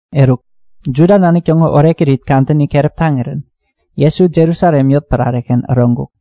Eruk Juda nanik täŋo orekirit kadäni keräp taŋirän Jesu Jerusalem yotpärare-ken äroŋkuk.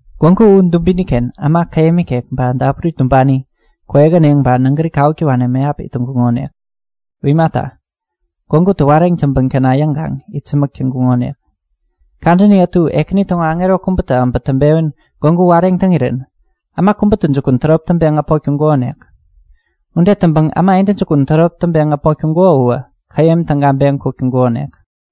Gwägu u dubini-ken äma käyäm ikek ba dapuri tumbani, kwäyähäneŋ ba nägäri kawuk täwani mäyap it täŋkuŋonik. [U imata, gwägutä wareŋ täŋpän käna yäŋkaŋ itsämäk täŋkuŋonik. Kadäni ätu Ekäni täŋo aŋero kubätä äbä täŋpewän gwägu wareŋ täŋirän äma kubätä jukun tärop taŋpeŋ äpmok täŋkukonik. Ude täŋpäŋ äma intäjukun tärop taŋpeŋ äpmok täŋkuko uwä käyäm tägaŋpeŋ kuk täŋkukonik.]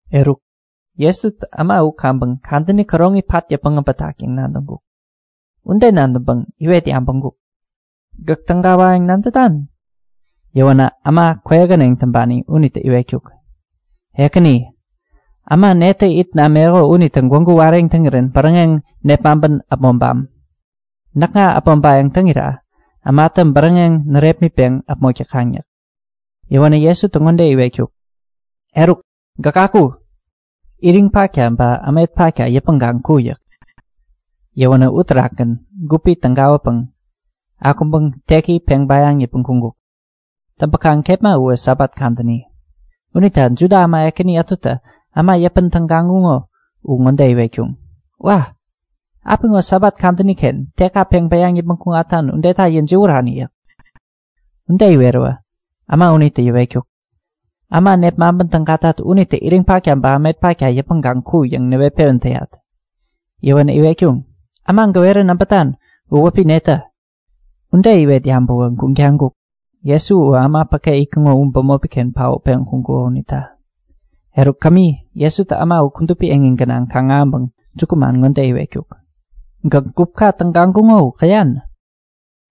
Eruk, Jesutä äma u kaŋpäŋ kadäni käroŋi pat yäpmäŋ äbätak yäŋ nadäŋkuk. Ude nadäŋpäŋ iwet yabäŋkuk; Gäk tägawayäŋ nadätan? Yäwänä äma kwäyähäneŋ täŋpani unitä iwetkuk; Ekäni, äma netä it nameko unitä gwägu wareŋ täŋirän bäräŋeŋ nepmaŋpän äpmoŋpam? Näkŋa äpmoŋpayäŋ täŋira ämatä bäräŋeŋ närepmitpeŋ äpmok täkaŋ yäk. Yäwänä Jesutä ŋode iwetkuk; Eruk, gäk aku! Iriŋ patka ba ämet patka yäpmäŋkaŋ ku! yäk. Yäwänä uterakgän gupi tägawäpäŋ akuŋpäŋ teki peŋ bäyaŋ yäpmäŋ kuŋkuk. Täŋpäkaŋ kepma uwä Sabat kadäni. Unita Juda äma ekäni ätutä äma yäpän tägaŋkuŋo u ŋode iwetkuŋ; Wa! Apiŋo Sabat kadäni-ken tekka peŋ bäyaŋ yäpmäŋ kuŋatan udeta yäjiwärani! yäk. Ude iweräwä äma unitä yäwetkuk; Äma nepmaŋpän tägatat unitä iriŋ patka ba ämet patka yäpmäŋkaŋ ku yäŋ näwet-pewän täyat. Yäwänä iwetkuŋ; Äma gäwerän äbätan u wäpi netä? Ude iwet yabäwäwä guŋ taŋkuk, Jesu uwä äma päke itkuŋo u bämopi-ken paotpeŋ kuŋkuko unita. Eruk kämi, Jesutä äma u kudupi eŋi gänaŋ kaŋ-ahäŋpäŋ jukuman ŋode iwetkuk; Gäk gupka tägaŋkuŋo u käyan?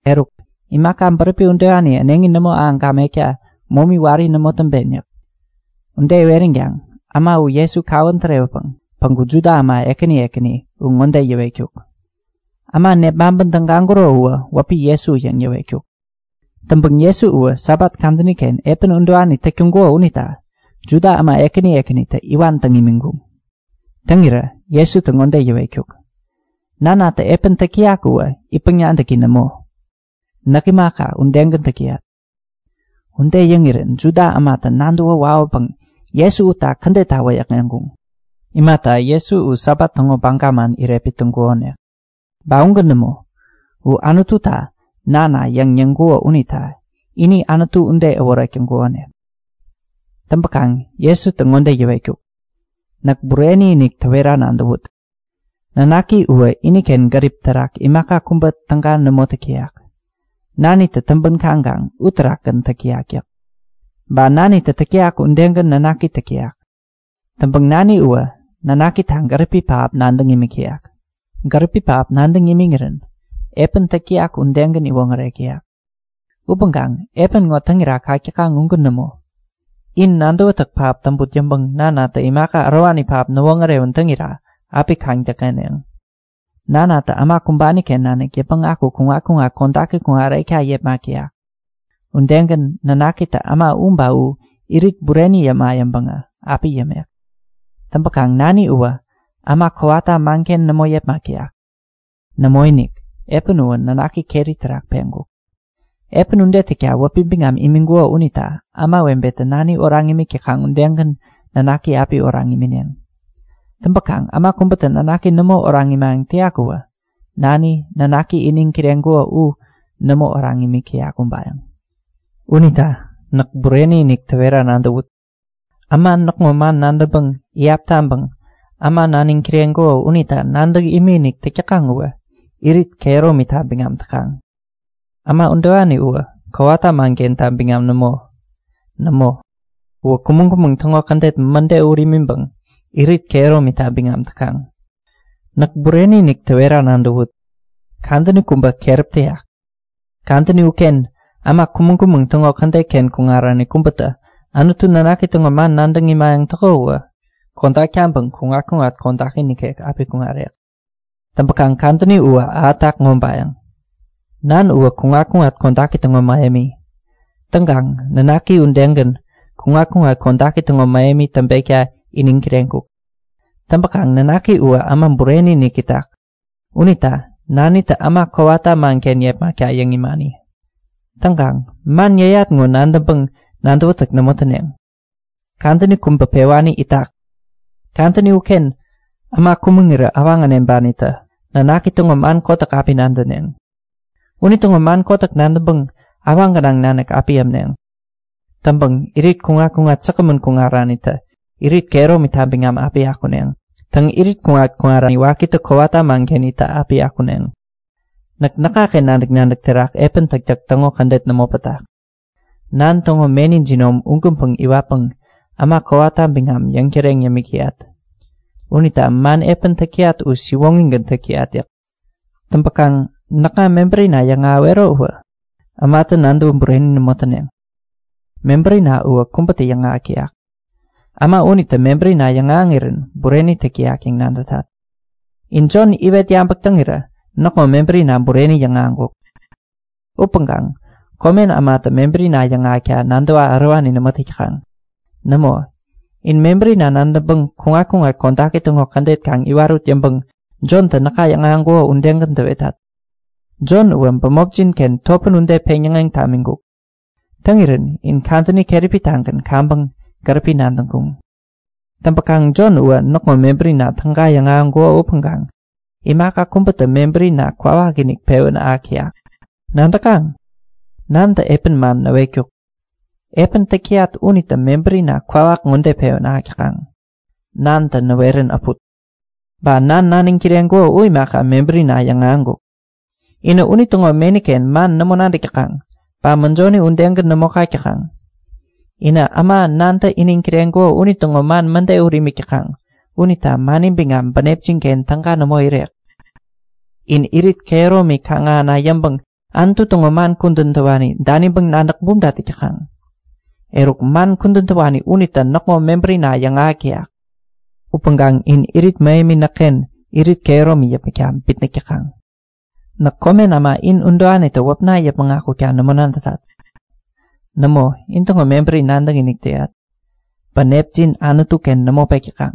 Eruk, imaka bäräpi udewani äneŋi nämo ahäŋ gamekta momi wari nämo täŋpen yäk. Ude iweränkaŋ äma u Jesu kawän tärewäpäŋ päŋku Juda äma ekäni ekäni u ŋode yäwetkuk; Äma nepmaŋpän tägaŋkuro uwä wäpi Jesu yäŋ yäwetkuk. Täŋpäkaŋ Jesu uwä Sabat kadäni-ken epän udewani täk täŋkuko unita Juda äma ekäni ekänitä iwan täŋ imiŋkuŋ. Täŋirä Jesutä ŋode yäwetkuk; Nanatä epän täk täyak uwä itpäŋ-nadäki nämo. Näk imaka, udegän täk täyat. Ude yäŋirän Juda ämatä nadäwä wawäpäŋ Jesu utta kädetta wäyäkŋeŋkuŋ. Imata, Jesu u Sabat täŋo baga man irepmit täŋkukonik. Ba ugän nämo, u Anututa Nana yäŋ yäŋkuko unita ini Anutu ude äworek täŋkukonik. Täŋpäkaŋ Jesutä ŋode yäwetkuk; Näk bureni-inik täwera nadäwut; Nanaki uwä iniken gäripi terak imaka kubä täga nämo täk täyak. Nanitä täŋpän kaŋkaŋ uterakgän täk täyak yäk. Ba Nanitä täk täyak udegän Nanaki täk täyak. Täŋpäŋ Nani uwä Nanakita gäripi pähap nadäŋ imik täyak. Gäripi pähap nadäŋ imiŋirän epän täk täyak udegän iwoŋärek täyak. Upäŋkaŋ epän ŋo täŋira kak täkaŋ ugän nämo. In nadäwätäk pähap täŋput yäŋpäŋ Nanatä imaka ärowani pähap näwoŋärewän täŋira api kaŋ-däkŋeneŋ. Nanatä äma kumbani-ken nanik yäpmäŋ aku kuŋat-kuŋat kodaki kuŋarekta yepmak täyak. Udegän Nanakitä äma u ba u irit bureni yäma yäŋpäŋä api yämek. Täŋpäkaŋ Nani uwä äma kowata manken nämo yepmak täyak. Nämoinik, epän uwä Nanaki keri terak peŋkuk. Epän ude täkta wäpi biŋam imiŋkuko unita ämawebetä Nani oraŋ imik täkaŋ udegän Nanaki api oraŋ imineŋ. Täŋpäkaŋ äma kubätä Nanaki nämo oraŋ imayäŋ täyak uwä Nani, Nanaki iniŋ kireŋkuko u nämo oraŋ imik täyak ubayäŋ. Unita näk bureni-inik täwera nadäwut; Äma näkŋo man nadäŋpäŋ iyap taŋpäŋ, äma naniŋ kireŋkuko unita nadäŋ imikinik täk täkaŋ uwä irit kehäromita biŋam täkaŋ. Äma udewani uwä kowata mankenta biŋam nämo. Nämo, uwä kumäŋ-kumäŋ täŋo kädet mäde ut imiŋpäŋ irit kehäromita biŋam täkaŋ. Näk bureni-inik täwera nadäwut; Kadäni kubä keräp täyak! Kadäni uken äma kumäŋ-kumäŋ täŋo kädet-ken kuŋarani kubätä Anutu Nanaki täŋo man nadäŋ imayäŋ täko uwä kodak taŋpäŋ kuŋat-kuŋat kodaki nikek api kuŋarek. Täŋpäkaŋ kadäni uwä ahätak ŋobayäŋ! Nan uwä kuŋat-kuŋat kodaki täŋo mähemi. Täŋkaŋ Nanaki udegän kuŋat-kuŋat kodaki täŋo mähemi täŋpekta iniŋ kireŋkuk. Täŋpäkaŋ nanaki uwä Äma Bureni-inik itak unita Nanitä äma kowata manken yepmakta yäŋ imani. Täŋkaŋ man yäyat ŋo nadäŋpäŋ nadäwätäk nämo täneŋ. Kadäni kubä pewani itak. Kadäni uken äma kumaŋirä awaŋ äneŋpanitä Nanaki täŋo man kotäk api nadäneŋ. Unitäŋo man kotäk nadäŋpäŋ awaŋ gänaŋ nanik api ämneŋ. Täŋpäŋ irit kuŋat-kuŋat säkgämän kuŋaranitä irit kehäromita biŋam api akuneŋ. Täŋ, irit kuŋat-kuŋari wakitä kowata manken itta api akuneŋ. Näk näkŋaken nadäk-nadäk terak epän täktäk täŋo kädet nämo pätak. Nan täŋo meni jinom ugänpäŋ iwatpäŋ äma kowata biŋam yäŋtäreŋ yämik täyat. Unita man epän täk täyat u siwoŋigän täk täyat yäk. Täŋpäkaŋ näkŋa mebärina yäŋahäwero uwä ämatä nadäwä bureni nämo täneŋ. Mebärina uwä kubätä yäŋahäk täyak. Äma unitä mebärina yäŋahäŋirän bureni täk täyak yäŋ nadätat. In Jon iwet yabäk täŋirä näkŋo mebärina bureni yäŋahäŋkuk. Upäŋkaŋ komen ämatä mebärina yäŋahäkta nadäwa ärowani nämo täk täkaŋ. Nämo, in mebärina nadäŋpäŋ kuŋat-kuŋat kodaki täŋo kädet kaŋ iwarut yäŋpäŋ Jontä näka yäŋahäŋkuko udegän täwetat. Jon uwä bämopjin-ken topän ude peŋyäŋeŋ tamiŋkuk. Täŋirän in kadäni keräpi-tagän kaŋpäŋ gäripi nadäŋkuŋ. Täŋpäkaŋ Jon uwä näkŋo mebärina täga yäŋahäŋkuko upäŋkaŋ imaka kubätä mebärina kwawakinik pewän ahäk täyak. Nadäkaŋ? Nantä epän man näwetkuk. Epän täk täyat unitä mebärina kwawak ŋode pewän ahäk täkaŋ; Nanatä näwerän äput. Ba Nan naniŋ kireŋkuko u imaka, mebärina yäŋahäŋkuk. Inä unitäŋo meni-ken man nämo nadäk täkaŋ ba mäjoni udegän nämo kak täkaŋ. Inä äma Nantä iniŋ kireŋkuko unitäŋo man mäde ut imik täkaŋ unita mani biŋam bänepjin-ken täga nämo irek. In irit kehäromi kaŋ-ahäna yäŋpäŋ Anutu täŋo man kudän täwani daniŋpäŋ nadäk bumta täk täkaŋ. Eruk, man kudän täwani unitä näkŋo mebärina yäŋahäk täyak! Upäŋkaŋ in irit mähemi näkken irit kehäromi yäpmäkta bitnäk täkaŋ. Näk komen äma in udewanitä wäpna yäpmäŋ akukta nämo nadätat. Nämo, intäŋo mebäri nadäkinik täyat. Bänepjin Anutu-ken nämo pek täkaŋ.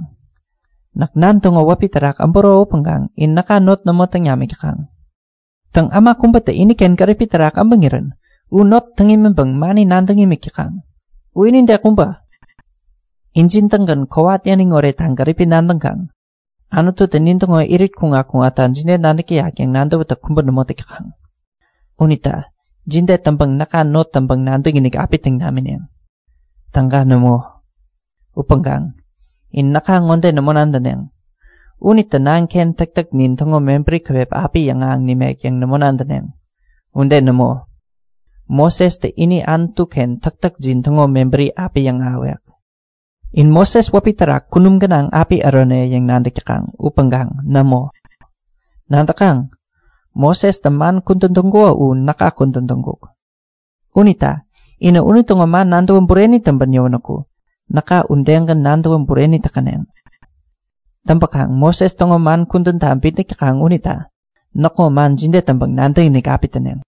Näk Nan täŋo wäpi terak äburo upäŋkaŋ in näka not nämo täŋ namik täkaŋ. Täŋ, äma kubätä iniken gäripi terak äbäŋirän u not täŋ imiŋpäŋ mani nadäŋ imik täkaŋ. U inide kubä! Injin-tägän kowat yäniŋ oretta gäripi nadäŋkaŋ Anututä nintäŋo irit kuŋat-kuŋatta jide nadäk täyak yäŋ nadäwätäk kubä nämo täk täkaŋ. Unita jide täŋpäŋ näka not täŋpäŋ nadäkinik api täŋ namineŋ? Täga nämo! Upäŋkaŋ in näka ŋode nämo nadäneŋ; Unitä Nanken täktäknin täŋo mebäri käwep api yäŋahäŋ nimek yäŋ nämo nadäneŋ. Ude nämo! Mosestä ini Anutu-ken täktäkjin täŋo mebäri api yäŋahäwek. In Moses wäpi terak kunum gänaŋ api ärone yäŋ nadäk täkaŋ upäŋkaŋ nämo! Nadäkaŋ? Mosestä man kudän täŋkuko u näka kudän täŋkuk. Unita inä unitäŋo man nadäwä bureni täŋpän yäwänäku näka udegän nadäwä bureni täkäneŋ. Täŋpäkaŋ Moses täŋo man kudänta bitnäk täkaŋ unita näkŋo man jide täŋpäŋ nadäkinik api täneŋ?